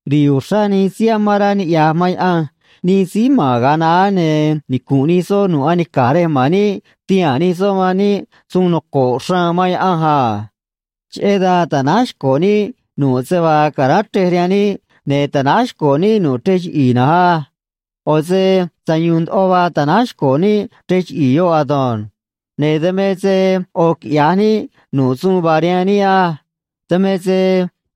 Ri̱i̱ uxrá nij síí amán rá niꞌya̱j man Yaꞌanj, nij síí ma̱n ga̱a naá, ne̱ nicu̱nꞌ nij soꞌ nu̱ꞌ anica̱j rej ma̱n níꞌ tihaa̱n nij soꞌ man níꞌ suun noco̱ꞌ xraan man Yaꞌanj a. Cheꞌé dan ta̱náj xco̱ níꞌ nu̱ꞌ se vaa ca̱ráán chrej rihaan níꞌ, ne̱ ta̱náj xco̱ níꞌ nu̱ꞌ chrej chiꞌi̱i̱ na̱nj á. ꞌO̱ se sayu̱u̱n ndoꞌo vaa ta̱náj xco̱ níꞌ chrej chiꞌi̱i̱ yoꞌ ado̱nj. Ne̱ dan me se ꞌo̱ quiꞌya̱j níꞌ nu̱ꞌ suun vaa rihaan níꞌ á. Dan me se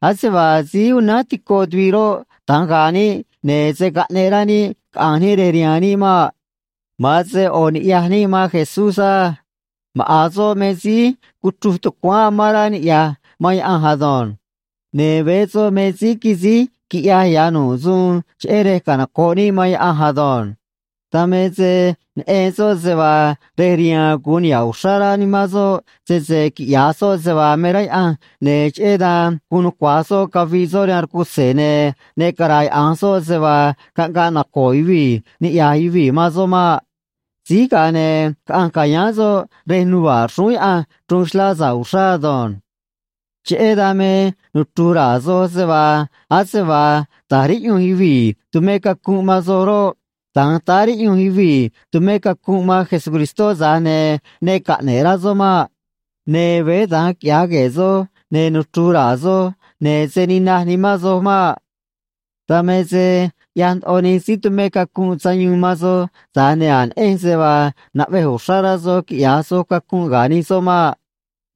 ase vaa síí unánj tico tuviꞌ roꞌ, da̱nj ga̱a̱ níꞌ, ne̱ se̱ caꞌneꞌ rá níꞌ caꞌa̱nj níꞌ rej rihaan níꞌ maꞌ. Ma̱an se ꞌo̱ ni̱ꞌyaj níꞌ man Jesús á. Maꞌa̱n soꞌ me se síí cuchruj tucuáán amán rá niꞌya̱j man Yaꞌanj ado̱nj. Ne̱ veé soꞌ me síí quisíj quiꞌyaj ya̱ nu̱ꞌ suun cheꞌé rej canoco̱ꞌ níꞌ man Yaꞌanj ado̱nj. Dan me se neꞌen soꞌ se vaa rej riha̱a̱n gu̱un niha̱ꞌ uxrá rá nimán soꞌ sese quiꞌya̱j soꞌ se vaa me rá Yaꞌanj, ne̱ cheꞌé dan guun nucua̱j soꞌ caviꞌ soꞌ rihaan rcutze̱, ne̱ ne cara̱yaꞌa̱nj soꞌ se vaa caꞌngaꞌ naco̱o̱ yuvii̱ niꞌya̱j yuvii̱ man soꞌ maꞌ. Síj ga̱a ne̱ caꞌanj ca̱yáán soꞌ rej nuva̱ꞌ xrúún Yaꞌanj, chruun xlá sa̱ꞌ uxrá ado̱nj. Cheꞌé dan me nuchru̱j ra̱a̱ soj se vaa ase vaa ta̱j riꞌyunj yuvii̱ tumé cacunꞌ man soj roꞌ, da̱nj táá riꞌyunj yuvii̱ tumé cacunꞌ man Jesucristó, tza̱j ne̱ ne caꞌne̱ꞌ rá soꞌ maꞌ. Ne̱ veé da̱nj quiꞌya̱j gue̱e̱ soj, ne̱ nuchru̱j ra̱a̱ soj, ne̱ se̱ ninaj nimán soj maꞌ. Dan me se ꞌyaj ndoꞌo nij síí tumé cacunꞌ sayuun man soj, tza̱j ne̱ a̱j neꞌenj se vaa naꞌvej uxrá rá soj quiꞌya̱j soj cacunꞌ ga̱ nij soꞌ maꞌ.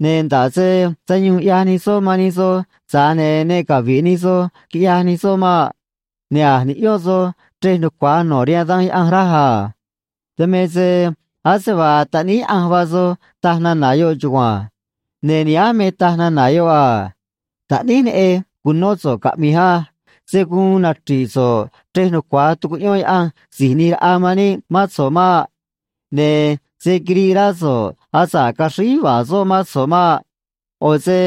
Ne̱ nda̱ꞌ se sayuun ꞌyaj nij soꞌ man nij soj, tza̱j ne̱ ne cavi̱ꞌ nij soj, quiꞌyaj nij soꞌ maꞌ. Ne̱ a̱j niꞌyón soj chrej nucua̱j no̱ rihaan Danj Yaꞌanj, raj a. Dan me se ase vaa taꞌníí Yaꞌanj vaa soj, taj nana̱ yoꞌ chugua̱nj. Ne̱ nihánj me taj nana̱ yoꞌ a: Taꞌníj neꞌej, cu̱nó so̱ꞌ caꞌmi̱j á. Se̱ guun nachri̱ꞌ so̱ꞌ chrej nucua̱j tucuꞌyón Yaꞌanj Si̱j ꞌNi̱j Raꞌa man níꞌ mán so̱ꞌ maꞌ. Ne̱ se̱ quiriꞌ rá so̱ꞌ asa̱ꞌ caxríj yuva̱a̱ soꞌ mán so̱ꞌ maꞌ. ꞌO̱ se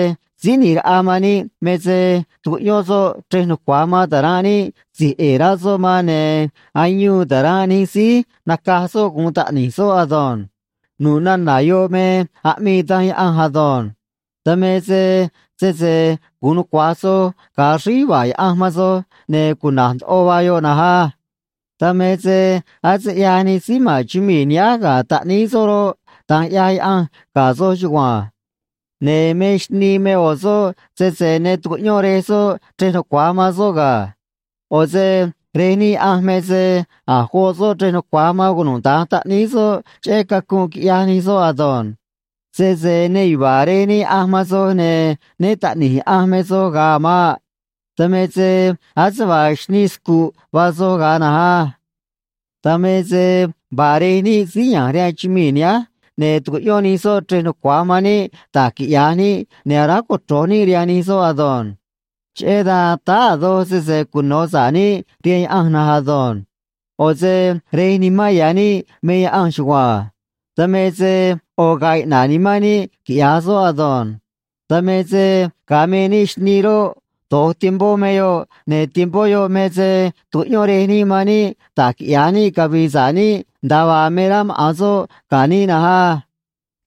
Síí ꞌNi̱j Raꞌa man níꞌ me se tucuꞌyón soꞌ chrej nucua̱j man ta̱ranꞌ níꞌ si̱j ꞌe̱e̱ rá soꞌ man, ne̱ ayuun ta̱ranꞌ nij síí nacaj soꞌ gu̱un taꞌni̱j soꞌ ado̱nj. Nu̱ꞌ nana̱ yoꞌ me aꞌmii Danj Yaꞌanj ado̱nj. Dan me se sese gu̱un nucua̱j soj ga̱a axríj yuva̱a̱ Yaꞌanj man soj, ne̱ cuna̱j ndoꞌo vaa yoꞌ na̱nj á. Dan me se ase ꞌyaj nij síí ma̱n chumii̱ nihánj ga̱ taꞌníí soꞌ roꞌ, da̱nj ꞌyaj Yaꞌanj ga̱ soj chugua̱nj. Ne̱ me xnii me ꞌo̱ soꞌ sese ne tucuꞌyón rej soꞌ chrej nucua̱j man soꞌ ga̱. ꞌO̱ se rej níꞌ Yaꞌanj me se a̱j goꞌ soꞌ chrej nucua̱j man cunuda̱nj taꞌníí soꞌ cheꞌé cacunꞌ quiꞌyaj nij soꞌ ado̱nj. Sese ne yuva̱a̱ Rej níꞌ Yaꞌanj man soj, ne̱ né taꞌni̱j Yaꞌanj me soj ga̱a a̱ maꞌ. Dan me se ase vaa xnii scu̱ꞌ vaa soj ga̱a na̱nj á. Dan me se vaa rej níꞌ síí ya̱nj rihaan chumii̱ nihánj, ne̱ tucuꞌyón nij soꞌ chrej nucua̱j man níꞌ da̱j quiꞌya̱j níꞌ, ne̱ aráj cochro̱j níꞌ rihaan nij soꞌ ado̱nj. Cheꞌé dan táá a̱ doj sese cuno̱ sa̱ꞌ níꞌ rihaan Yaꞌanj na̱nj ado̱nj. ꞌO̱ se Rej nimán ya̱ níꞌ me Yaꞌanj chugua̱nj. Dan me se ꞌo̱ ga̱a̱ iꞌna̱ꞌ nimán níꞌ, quiꞌya̱j soꞌ ado̱nj. Dan me se ga̱a me níꞌ xnii roꞌ, do̱j tiempó me yoꞌ, ne̱ tiempó yoꞌ me se tucuꞌyón rej níꞌ man níꞌ da̱j quiꞌya̱j níꞌ cavi̱i̱ sa̱ꞌ níꞌ, nda̱a vaa me rá maꞌa̱n soꞌ ga̱ níꞌ na̱nj á.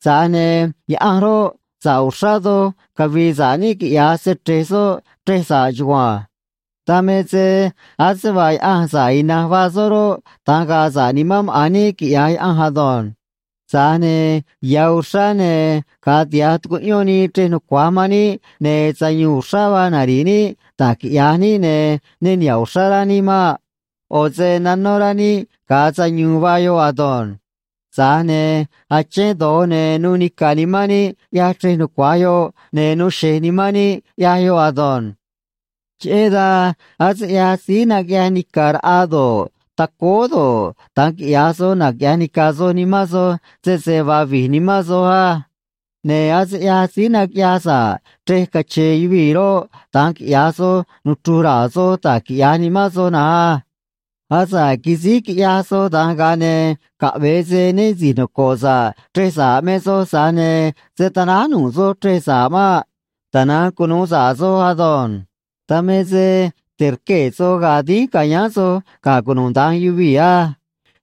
Tza̱j ne̱ Yaꞌanj roꞌ, sa̱ꞌ uxrá doj cavi̱i̱ sa̱ꞌ níꞌ, quiꞌya̱j se‑chre̱j soꞌ chrej sa̱ꞌ chugua̱nj. Dan me se ase vaa Yaꞌanj, sa̱ꞌ ina̱nj vaa soꞌ roꞌ, da̱nj ga̱a̱ sa̱ꞌ nimán maꞌa̱n níꞌ, quiꞌya̱j Yaꞌanj ado̱nj. Tza̱j ne̱ ya̱ uxrá, ne̱ ga̱a tiha̱j tucuꞌyón nii chrej nucua̱j man níꞌ, ne̱ sayu̱u̱n uxrá vaa nari̱ꞌ níꞌ da̱j quiꞌya̱j níꞌ, ne̱ ne niha̱ꞌ uxrá rá níꞌ maꞌ. ꞌO̱ se nanó rá níꞌ, ga̱a sayu̱u̱n vaa yoꞌ ado̱nj. Tza̱j ne̱ achén do̱j, ne̱ nuu nica̱ nimán níꞌ ꞌyaj chrej nucua̱j yoꞌ, ne̱ nuu xe̱j nimán níꞌ, ꞌyaj yoꞌ ado̱nj. Cheꞌé dan ase ꞌyaj síí naquiꞌyaj nica̱ raꞌa do̱ꞌ, tacóó do̱ꞌ, da̱nj quiꞌya̱j soj, naquiꞌya̱j nica̱ soj nimán soj sese vaa vi̱j nimán soj á. Ne̱ ase ꞌyaj síí naquiꞌyaj sa̱ꞌ chrej cache̱e̱ yuvii̱ roꞌ, da̱nj quiꞌya̱j soj, nuchru̱j ra̱a̱ soj da̱j quiꞌya̱j nimán soj na̱nj á. Asa̱ꞌ quisíj quiꞌyaj soj da̱nj, ga̱a ne̱ caꞌve̱e se né si̱j noco̱ꞌ sa̱ꞌ chrej sa̱ꞌ me soj, tza̱j ne̱ se̱ tanáj nu̱ꞌ soj chrej sa̱ꞌ maꞌ. Tana̱nj cunu̱u sa̱ꞌ soj ado̱nj. Dan me se te̱rquee̱ soj ga̱a̱ dínj ca̱yáán soj ga̱ cunuda̱nj yuvii̱ á.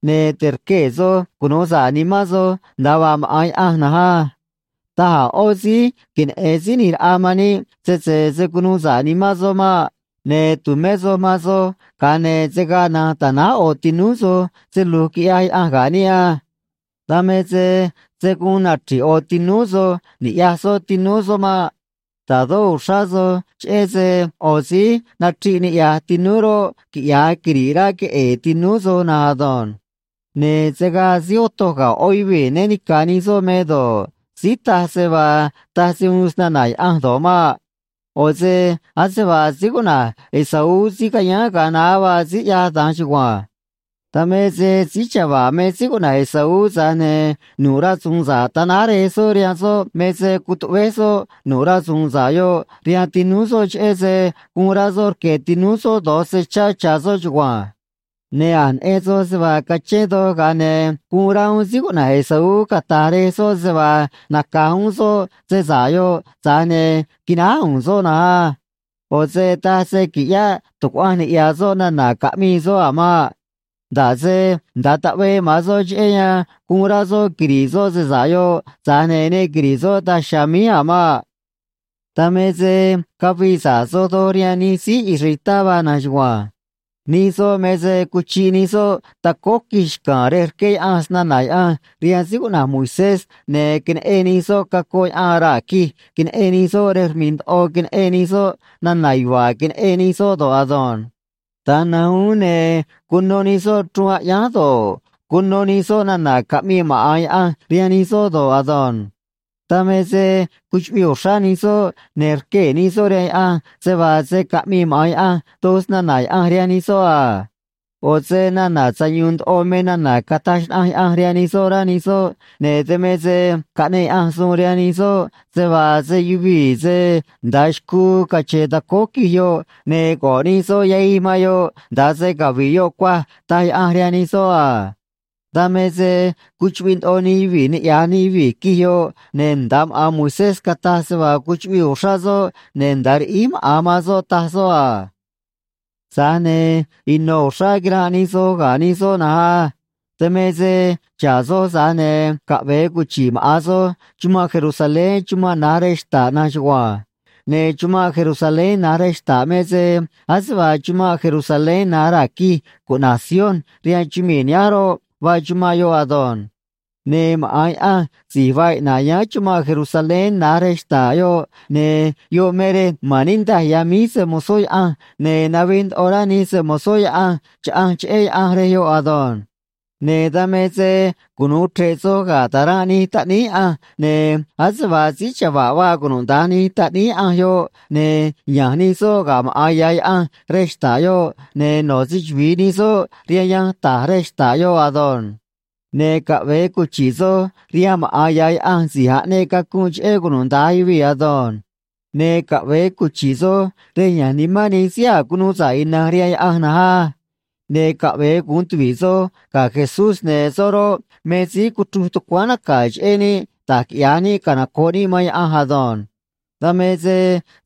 Ne̱ te̱rquee̱ soj cunu̱u sa̱ꞌ nimán soj nda̱a vaa maꞌa̱n Yaꞌanj na̱nj á. Taj a̱ ꞌó síí queneꞌe̱n Síí ꞌNi̱j Raꞌa man níꞌ sese se̱ cunu̱u sa̱ꞌ nimán soꞌ maꞌ. Ne̱ tu̱mé soj man soj, ga̱a ne̱ se̱ gaa na̱nj ta̱náj ꞌo̱ tinúú soj se lu̱j quiꞌyaj Yaꞌanj ga̱ níꞌ á. Dan me se se̱ guun nachri̱ꞌ ꞌo̱ tinúú soj ni̱ꞌyaj soꞌ tinúú soꞌ maꞌ. Ta̱dó uxrá soj cheꞌé se ꞌo̱ síí nachriꞌ niꞌya̱j tinúú roꞌ, quiꞌya̱j quiri̱ꞌ rá queꞌe̱e̱ tinúú soj na̱nj ado̱nj. Ne̱ se̱ gaa síí otoj ga̱ ꞌó yuvii̱ né ni̱ca̱ nij soꞌ me do̱ꞌ, síí taj se vaa taj se uun snana̱ Yaꞌanj do̱ꞌ maꞌ. ꞌO̱ se ase vaa síí cuꞌna̱j Esaú síí cayáán ga̱a naá vaa síí ꞌyaj da̱nj chugua̱nj. Dan me se síí chava̱ꞌ me síí cuꞌna̱j Esaú, tza̱j ne̱ nu̱ꞌ rasu̱u̱n sa̱ꞌ ta̱náj rej soꞌ rihaan soꞌ me se cutuꞌvéj soꞌ nu̱ꞌ rasu̱u̱n sa̱ꞌ yoꞌ rihaan tinúú soꞌ, cheꞌé se guun rá soꞌ rque̱ tinúú soꞌ do̱j se chá cha̱ soꞌ chugua̱nj. Ne̱ a̱j neꞌen soj se vaa cachén doj, ga̱a ne̱ guun rá uún síí cuꞌna̱j Esaú cata̱j rej soꞌ se vaa naca̱j uún soꞌ se sa̱ꞌ yoꞌ, tza̱j ne̱ quináj u̱u̱n soꞌ na̱nj á. ꞌO̱ se taj se qui̱ꞌyáꞌ tu̱cuaꞌanj niꞌya̱ soꞌ nana̱ caꞌmii soꞌ a̱ maꞌ. Nda̱ꞌ se nda̱a taꞌvee maꞌa̱n soꞌ cheꞌé yan guun rá soꞌ quiri̱ꞌ soꞌ se sa̱ꞌ yoꞌ, tza̱j ne̱ ne quiri̱ꞌ soꞌ daj chiha̱a̱ míj a̱ maꞌ. Dan me se cavii sa̱ꞌ soj doj rihaan nij síí israelitá vaa na̱nj chugua̱nj. Nij soꞌ me se cuchiꞌ nij soꞌ tacóó quij xca̱a̱n rej rqué Yaꞌanj snana̱ Yaꞌanj rihaan síí cuꞌna̱j Moisés, ne̱ queneꞌen nij soꞌ cacoꞌ yaꞌan raa̱ quij queneꞌen nij soꞌ rej rmi̱ꞌ ndoꞌo queneꞌen nij soꞌ nana̱ yuva̱a̱ queneꞌen nij soꞌ do̱ꞌ ado̱nj. Da̱nj na̱nj uún, ne̱ cuno nij soꞌ chruun aꞌyánj do̱ꞌ, cuno nij soꞌ nana̱ caꞌmii maꞌa̱n Yaꞌanj rihaan nij soꞌ do̱ꞌ ado̱nj. Dan me se cuchuꞌviꞌ uxrá nij soꞌ, ne̱ rquee̱ nij soꞌ rihaan Yaꞌanj se vaa se̱ caꞌmii maꞌa̱n Yaꞌanj doj snana̱ Yaꞌanj rihaan nij soꞌ a. ꞌO̱ se nana̱ sayu̱u̱n ndoꞌo me nana̱ cataj xnaꞌanj Yaꞌanj rihaan nij soꞌ, rá nij soꞌ, ne̱ dan me se caꞌneꞌ Yaꞌanj suun rihaan nij soꞌ se vaa se yuvii̱ se nda̱a xcuu cache̱e̱ tacóó quij yoꞌ, ne̱ go̱ꞌ nij soꞌ yahij man yoꞌ nda̱a se cavi̱ꞌ yoꞌ cuaj, taj Yaꞌanj rihaan nij soꞌ a. Dan me se cuchuꞌviꞌ ndoꞌo nij yuvii̱ niꞌya̱j nij yuvii̱ quij yoꞌ, ne̱ nda̱a maꞌa̱n Moisés cataj se vaa cuchuꞌviꞌ uxrá soꞌ ne̱ nda̱a riꞌíj maꞌa̱n man soꞌ, taj soꞌ a. Tza̱j ne̱ ino̱ uxrá quiranꞌ nij soj ga̱ nij soꞌ na̱nj á. Dan me se xa̱ꞌ soj, tza̱j ne̱ caꞌve̱e cuchi̱ꞌ maꞌa̱n soj chumanꞌ Jerusalén chumanꞌ na̱j rej xta̱ꞌ na̱nj chugua̱nj. Ne̱ chumanꞌ Jerusalén na̱j rej xta̱ꞌ me se ase vaa chumanꞌ Jerusalén na̱j raa̱ quij cuꞌna̱j Sion rihaan chumii̱ nihánj roꞌ, vaa chumanꞌ yoꞌ ado̱nj. Ne̱ maꞌa̱n Yaꞌanj si̱j vaa iꞌna̱ꞌ yáán chumanꞌ Jerusalén na̱j rej xta̱ꞌ yoꞌ, ne̱ yoꞌ me rej ma̱n niꞌndaj ya̱ míj se‑mo̱zó Yaꞌanj, ne̱ navij ndoꞌo rá nij se‑mo̱zó Yaꞌanj chaꞌanj cheꞌé Yaꞌanj rej yoꞌ ado̱nj. Ne̱ dan me se cunu̱u chre̱ꞌ soj ga̱ ta̱ranꞌ nij taꞌníí Yaꞌanj, ne̱ ase vaa síí chava̱ꞌ vaa cunuda̱nj nij taꞌníí Yaꞌanj yoꞌ, ne̱ ya̱nj nij soꞌ ga̱ maꞌa̱n ya̱ Yaꞌanj rej xta̱ꞌ yoꞌ, ne̱ no̱ se‑chuvi̱i nij soꞌ rihaan yanj ta̱j rej xta̱ꞌ yoꞌ ado̱nj. Ne̱ caꞌve̱e cuchi̱ꞌ soj rihaan maꞌa̱n ya̱ Yaꞌanj si̱j aꞌneꞌ cacunꞌ cheꞌé cunuda̱nj yuvii̱ ado̱nj. Ne̱ caꞌve̱e cuchi̱ꞌ soj rej ya̱nj nimán nij síí a̱j cunuu sa̱ꞌ ina̱nj rihaan Yaꞌanj na̱nj á. Ne̱ caꞌve̱e gu̱un tuvi̱ꞌ soj ga̱ Jesús, ne̱ soꞌ roꞌ, me síí cuchruj tucuáán naca̱ cheꞌé níꞌ da̱j quiꞌya̱j níꞌ canoco̱ꞌ níꞌ man Yaꞌanj ado̱nj. Dan me se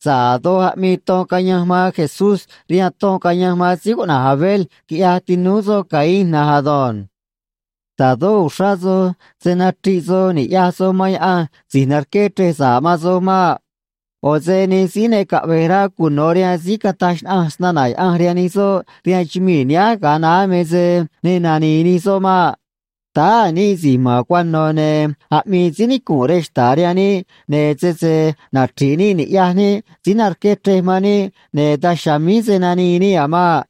sa̱ꞌ a̱ doj aꞌmii ton cayanj man Jesús rihaan ton cayanj man síí cuꞌna̱j Abel quiꞌyaj tinúú soꞌ Caín na̱nj ado̱nj. Ta̱dó uxrá soj se̱ nachriꞌ soj ni̱ꞌyaj soj man Yaꞌanj si̱j narqué chrej sa̱ꞌ man soj maꞌ. ꞌO̱ se nij síí ne caꞌve̱j rá cuno̱ rihaan síí cataj xnaꞌanj snana̱ Yaꞌanj rihaan nij soꞌ rihaan chumii̱ nihánj ga̱a naá me se ne nani̱i̱ nij soꞌ maꞌ. Táá a̱ níꞌ si̱j ma̱n cuano̱, ne̱ aꞌmii síí nicu̱nꞌ rej xta̱ꞌ rihaan níꞌ, ne̱ sese nachri̱ꞌ níꞌ ni̱ꞌyaj níꞌ síí narqué chrej man níꞌ, ne̱ daj chiha̱a̱ míj se̱ nanii níꞌ a̱ maꞌ.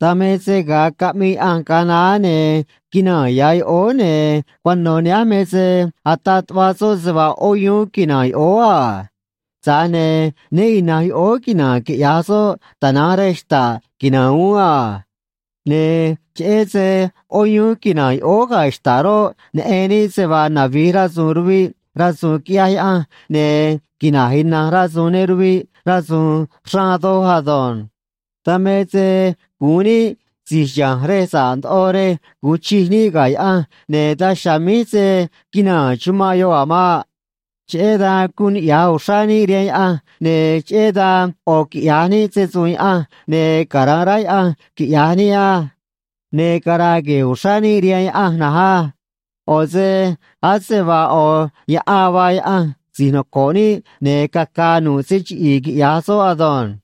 Dan me se ga̱a caꞌmii Yaꞌanj ga̱a naá, ne̱ quinaa̱n ya̱ yoꞌóó, ne̱ cuano̱ nihánj me se ataꞌ tuꞌva soꞌ se vaa ꞌó yuún quina̱a̱n yoꞌóó a. Tza̱j ne̱ né ina̱nj yoꞌóó quina̱a̱n quiꞌya̱j soꞌ, tana̱nj rej xta̱ꞌ quina̱a̱n uún a. Ne̱ cheꞌé se “ꞌó yuún” quina̱a̱n yoꞌóó ga̱ xta̱ꞌ roꞌ, neꞌen níꞌ se vaa navi̱j rasu̱u̱n ruviꞌ, rasu̱u̱n quiꞌyaj Yaꞌanj, ne̱ quina̱j ina̱nj rasu̱u̱n ne ruviꞌ rasu̱u̱n xraan doj ado̱nj. Dan me se gu̱un níꞌ si̱j chiha̱nj rej sa̱ꞌ ndoꞌo rej gu̱un chij níꞌ ga̱ Yaꞌanj, ne̱ daj chiha̱a̱ míj se̱ quinaa̱n chumanꞌ yoꞌ a̱ maꞌ. Cheꞌé dan guun niꞌya̱j uxrá níꞌ rihaan Yaꞌanj, ne̱ cheꞌé dan ꞌo̱ quiꞌya̱j níꞌ se‑su̱u̱n Yaꞌanj, ne̱ cara̱nꞌ rá Yaꞌanj, quiꞌya̱j níꞌ á. Ne̱ cara̱a̱ gue̱e̱ uxrá níꞌ rihaan Yaꞌanj na̱nj á. ꞌO̱ se ase vaa ꞌo̱ yaꞌan vaa Yaꞌanj si̱j noco̱ꞌ níꞌ, ne̱ caca̱a̱ nu̱ꞌ se chiꞌi̱i̱, quiꞌya̱j soꞌ ado̱nj.